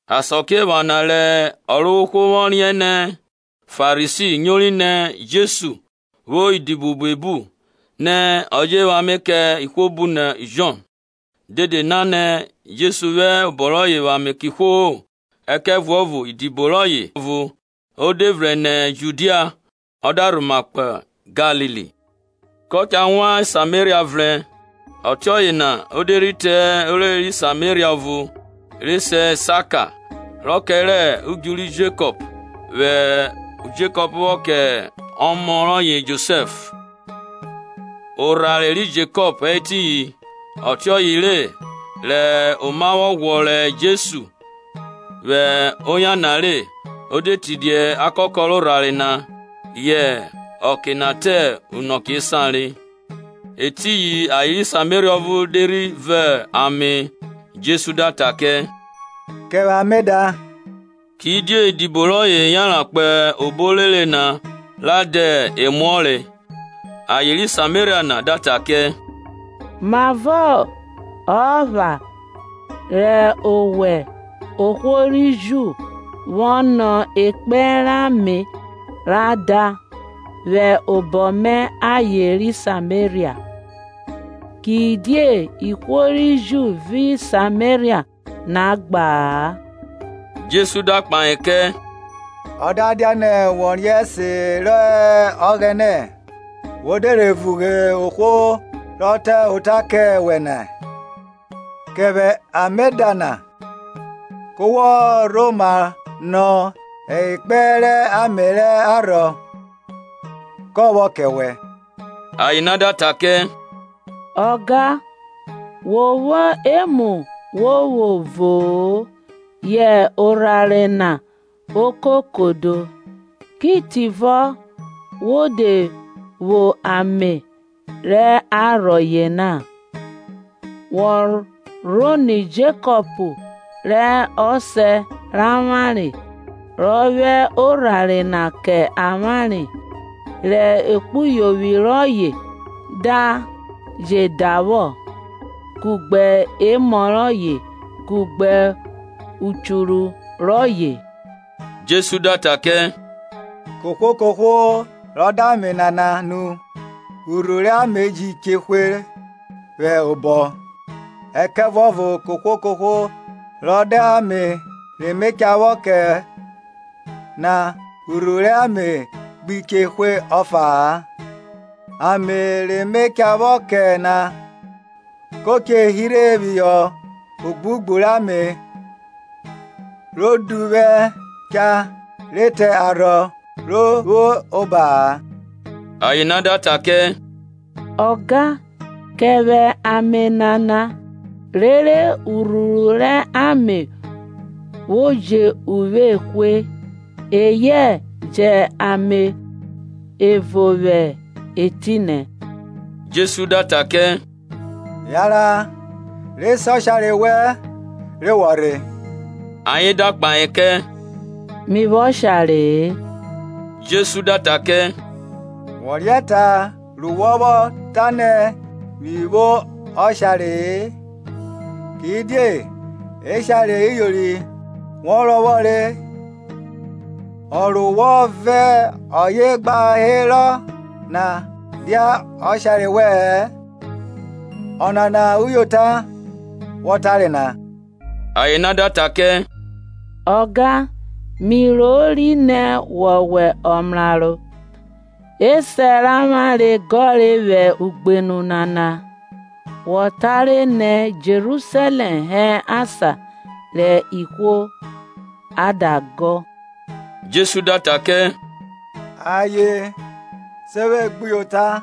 Asakiephana rẹ Ọrovwohwo vwọ riẹn nẹ Farisi nyori nẹ Jesu vwo idibo buebu nẹ ọ je vwẹ ame kẹ ihwo bu nọ Jọn, (dede na Jesu vwẹ obọ rọye vwẹ ame kẹ ihwo-o, ẹkẹvuọvo idibo rọye ọvo), o de vrẹn nẹ Judia ọ da rhoma kpo Galili. Kọ cha wan Sameria vrẹn. Ọtioye na o de rhi te orere ri Sameria ọvo, re se Saka, rọ kẹrẹ udju ri Jekọp vwọ kẹ ọmọ rọye Josẹf. Orhare ri Jekọp hẹ etiyin, ọtiọye re, rẹ oma vwọ ghwọrọ Jesu vwẹ oyan na re, o de tidia akakọ rẹ orhare na. Yẹ ọke na te unọke esan re. Etiyin aye ri Sameria ọvo de rhi vo ame. Jesu da ta kẹ, Kẹ vwẹ ame da. Kidie idibo rọye yanran kpo obo orere na ra dẹ emuọre. Aye ri Sameria na da ta kẹ, Mavọ ọ epha re o wẹ, ohwo ri Ju, vwọ nọ ekpẹn rẹ ame ra da, vwẹ obọ mẹ aye ri Sameria? Kidie ihwo ri Ju vẹ ihwo rẹ Sameria na gba-a. Jesu da kpahe kẹ, Ọ da dianẹ wo riẹn ẹse rẹ Ọghẹnẹ, wo de rhe vughe ohwo rọ ta ota kẹ wẹ nẹ, Kẹ vwẹ ame da na, ku wa rhoma nọ ekpẹn rẹ ame rẹ arhọ, ka vwọ kẹ wẹ. Aye na da ta kẹ, Ọga, wo vwo emu wo vwo vo-o, yẹ orhare na okokodo; ki tivọ wo de vwo ame rẹ arhọ yena? Wọ rhonọ Jekọp rẹ ọsẹ rẹ avwanre, rọ vwẹ orhare na kẹ avwanre, rẹ ekpuyovwi rọye da je da vwọ, kugbe emọ rọye, kugbe uchuru rọye? Jesu da ta kẹ, Kohwo kohwo rọ da ame nana nu urhuru rẹ ame ji che hwe vwẹ obọ, ẹkẹvuọvo kohwo kohwo rọ da ame re me cha vwọ kẹ na urhuru rẹ ame gbi che hwe ọfa-a; ame re me cha vwọ kẹ na ko che hirhe phihọ ogbugbu rẹ ame ro duvwẹ cha re te arhọ ro vwo oba-a. Aye na da ta kẹ, Ọga, kẹ vwẹ ame nana, rere urhuru rẹ ame vwo jẹ uvwe ehwe, eyẹ jẹ ame evo vwẹ etinẹ. Jesu da ta kẹ, Yanran, re se ọshare wẹn, rere wọ rhe. Ayen da kpahe kẹ, mi vwo ọshare-e. Jesu da ta kẹ, Wo riẹn ta ru wọ vwọ tanẹ, mi vwo ọshare-e; Kidie eshare iyori wọ rọvwọ re, ọ ru wọ vẹ ọye gba herọ na dia ọshare wẹ-ẹn; ọnana uyota wọ tare na. Aye na da ta kẹ, Ọga, mi rori nẹ wọwẹ ọmraro. Esẹ rẹ avwanre gọre vwẹ ugbenu nana; wọ tare nẹ Jerusalẹm hẹ asan rẹ ihwo a da gọ, Jesu da ta kẹ, Aye, se vwe gbuyota,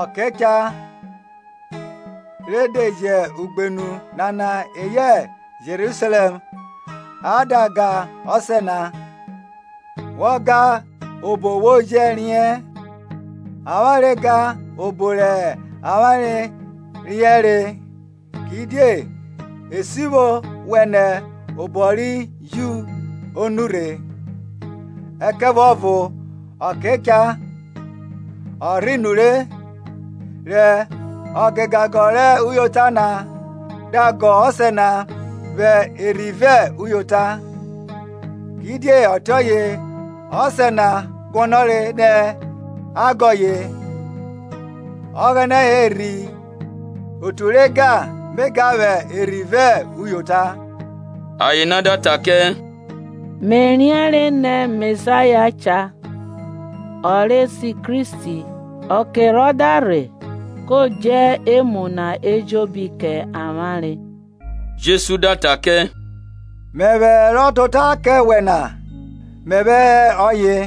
ọke cha re de jẹ ugbenu nana eyẹ Jerusalẹm a da ga Ọsẹ na. Wọ ga obo wo jẹ riẹn, avwanre ga obo rẹ avwanre riẹnre, kidie esivwo vwenẹ obọ ri Ju o nurhe. Ẹkẹvuọvo ọke cha, ọ rhe nure, rẹ ọ gegagọ rẹ uyota na da gọ Ọsẹ na vwẹ erhi vẹ uyota, kidie ọtiọye Ọsẹ na guọnọre nẹ a ga ọye. Ọghẹnẹ hẹ erhi, otu re ga me ga vwẹ erhi vẹ uyota. Aye na da ta kẹ, Me riẹnre nẹ Mesaya cha (ọ re se Kristi); ọke rọ da rhe, ko dje emu na ejobi kẹ avwanre. Jesu da ta kẹ, mẹvwẹ ro ta ota kẹ wẹ na mẹvwẹ hẹ ọye.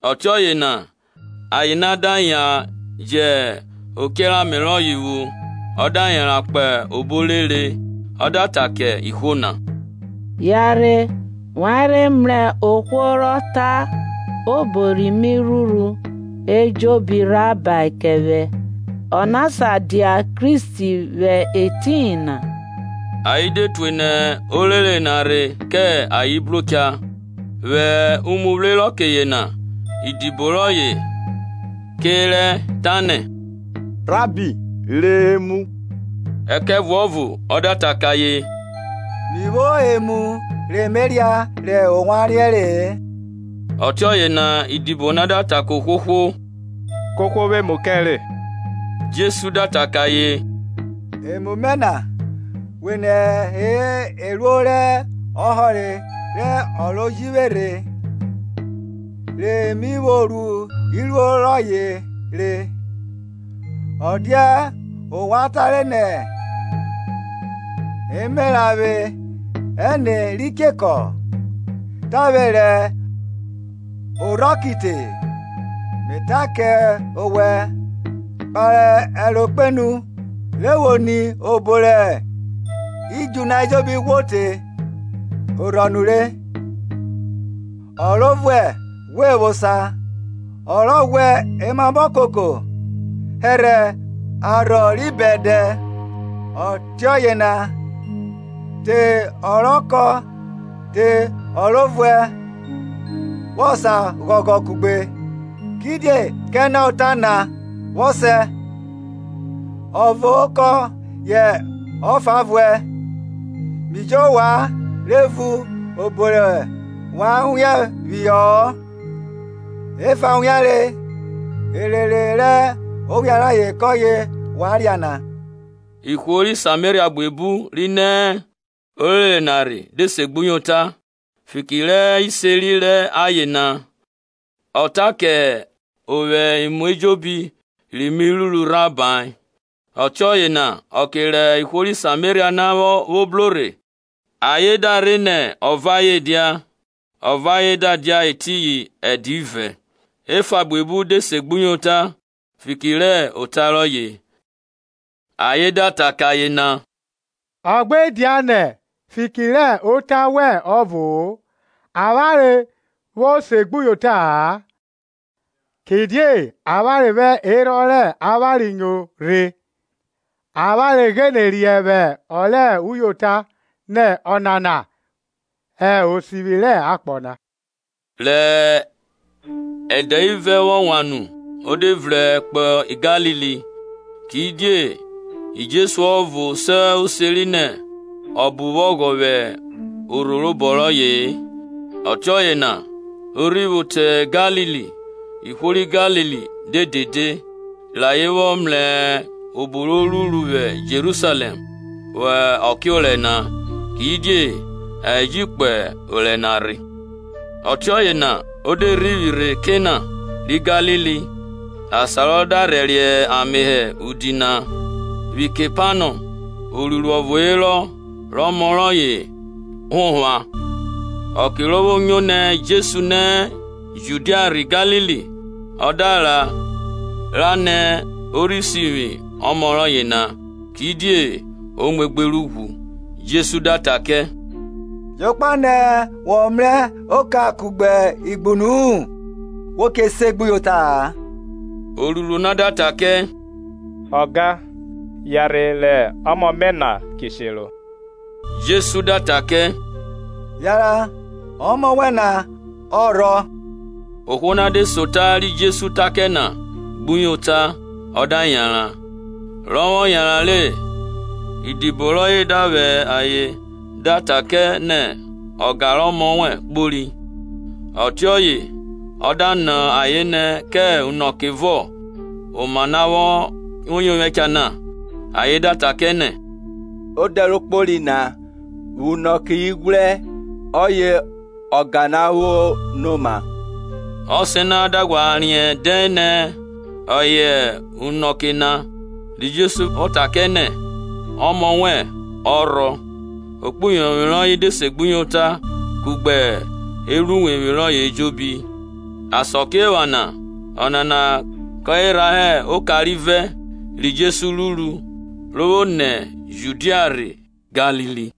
Ọtioye na aye na da yan jẹ ochẹ rẹ ame rọye vwo, ọ da yanran kpo obo orere, ọ da ta kẹ ihwo na, Yanrhe, wa rhe mrẹ ohwo rọ ta obo ri mi ruru ejobi rhabae kẹ vwẹ. Ọna sa dia Kristi vwẹ etiyin na? Ayen de tue nẹ orere na rhe kẹ ayen bro cha. Vwẹ umuvwre rẹ ọke yena idibo rọye ke rẹ, tanẹ, Rabbi, re emu. Ẹkẹvuọvo ọ da kẹ ayen, Mi vwo emu re me ria rẹ ovwan riẹnre-e. Ọtiọye na idibo na da ta kẹ ohwohwo, Kẹ ohwo vwẹ emu kẹ re? Jesu da ta kẹ ayen, Emu mẹ vwenẹ hẹ eruo rẹ ọhọre rẹ ọ ro ji vwe rhe, re mi vwo ru iruo rọye re. Ọ dia ovwan tare nẹ, Emeranvwe ẹne ri chekọ, tavwe rẹ orhọ ki te? Me ta kẹ owẹ, kpare ẹro kpenu, rẹ wo ni obo rẹ idju na ejobi ghwo te orhọ nure. Ọ ro vuẹ ghwe vwo osa, ọ ghwẹ emamọ koko hẹrhẹ arhọ ri bẹdẹ, ọtiọye na te ọ rọ kọn te ọ ro vuẹ vwọ sa ghọghọ kugbe. Kidie kẹ ọna ọta na vwọ sẹ, Ọvo kọn yẹ ọfa vuẹ. Mi ji ovwan re vun obo rẹ wa wian phihọ-ọ, efa wianre, erere rẹ owian rayen kọye ovwan ria na. Ihwo ri Sameria buebu ri nẹ orere na rhe de se gbuyota fiki rẹ iseri rẹ aye na, Ọ ta kẹ ovwe emu ejobi ri mi ruru rhahae. Ọtiọye na ọke rẹ ihwo ri Sameria na vwo bro rhe, ayen da rẹ nẹ ọ vẹ ayen dia; ọ vẹ ayen da dia etiyin ẹdẹ ivẹ. Efa buebu de segbuyota fiki rẹ ota rọye. Ayen da ta kẹ aye na, Ọ gbe dianẹ fiki rẹ ota wẹn ọvo avwanre vwo segbuyota-a, kidie avwanre vwẹ erhọn rẹ avwanre nyo rhe, avwanre gbine riẹn vwẹ ọ rẹ uyota nẹ ọnana hẹ Osivwi rẹ akpọ na. Rẹ ẹdẹ ivẹ vwọ wan nu o de vrẹn kpo Galili. Kidie Jesu ọvo se oseri nẹ ọbo vwo ọghọ vwẹ orho robọ rọye-e. Ọtiọye na ro rhi vwo te Galili, ihwo ri Galili de dede, rẹ ayen vwọ mrẹ obo ro ruru vwi Jerusalẹm vwẹ ọke orẹ na, kidie ayen ji kpo orẹ na rhe. Ọtiọye na o de rhivwi rhe Kana ri Galili, asan rọ da rhẹriẹ ame hẹ udi na. Vwi Kepanọm oruiruo ọvo herọ rẹ ọmọ rọye honvwa. Ọke ro vwo nyo nẹ Jesu nẹ Judia rhe Galili, ọ da ra ra rẹ nẹ ọ rhe rhi sivwi ọmọ rọye na, kidie o muegbe rẹ ughwu. Jesu da ta kẹ, Jokpa nẹ wọ mrẹ oka kugbe igbunu-u wo che segbuyota-a. Osun na da ta kẹ, Ọga, yanrhe re ọmọ mẹ na ki shero. Jesu da ta kẹ, Yanran, ọmọ wẹn na cha rhọ. Ohwo na de se ota ri Jesu ta kẹ na gbuyota ọ da yanran. Rọ vwọ yanran re, idibo rọye da vwa ayen da ta kẹ nẹ, Ọga rẹ ọmọ na kpori re. Ọtiọye ọ da nọ ayen nẹ kẹ unọke vọ oma na vwo yovwẹ cha na, ayen da ta kẹ, Ọdẹ ro kpori na vwẹ unọke ighwrẹ ọye ọga na vwo no oma. Ọsẹ na da ghwa riẹn dẹn nẹ ọye hẹ unọke na ri Jesu vwọ ta kẹ nẹ, Ọmọ wẹn na cha rhọ; ekpuyovwi rọye dẹ segbuyota, kugbe evwruwevwi rọye ejobi. Asakiephana ọnana kọye rha hẹ ọka rivẹ ri Jesu ruru ro vwo nẹ Judia rhe Galili.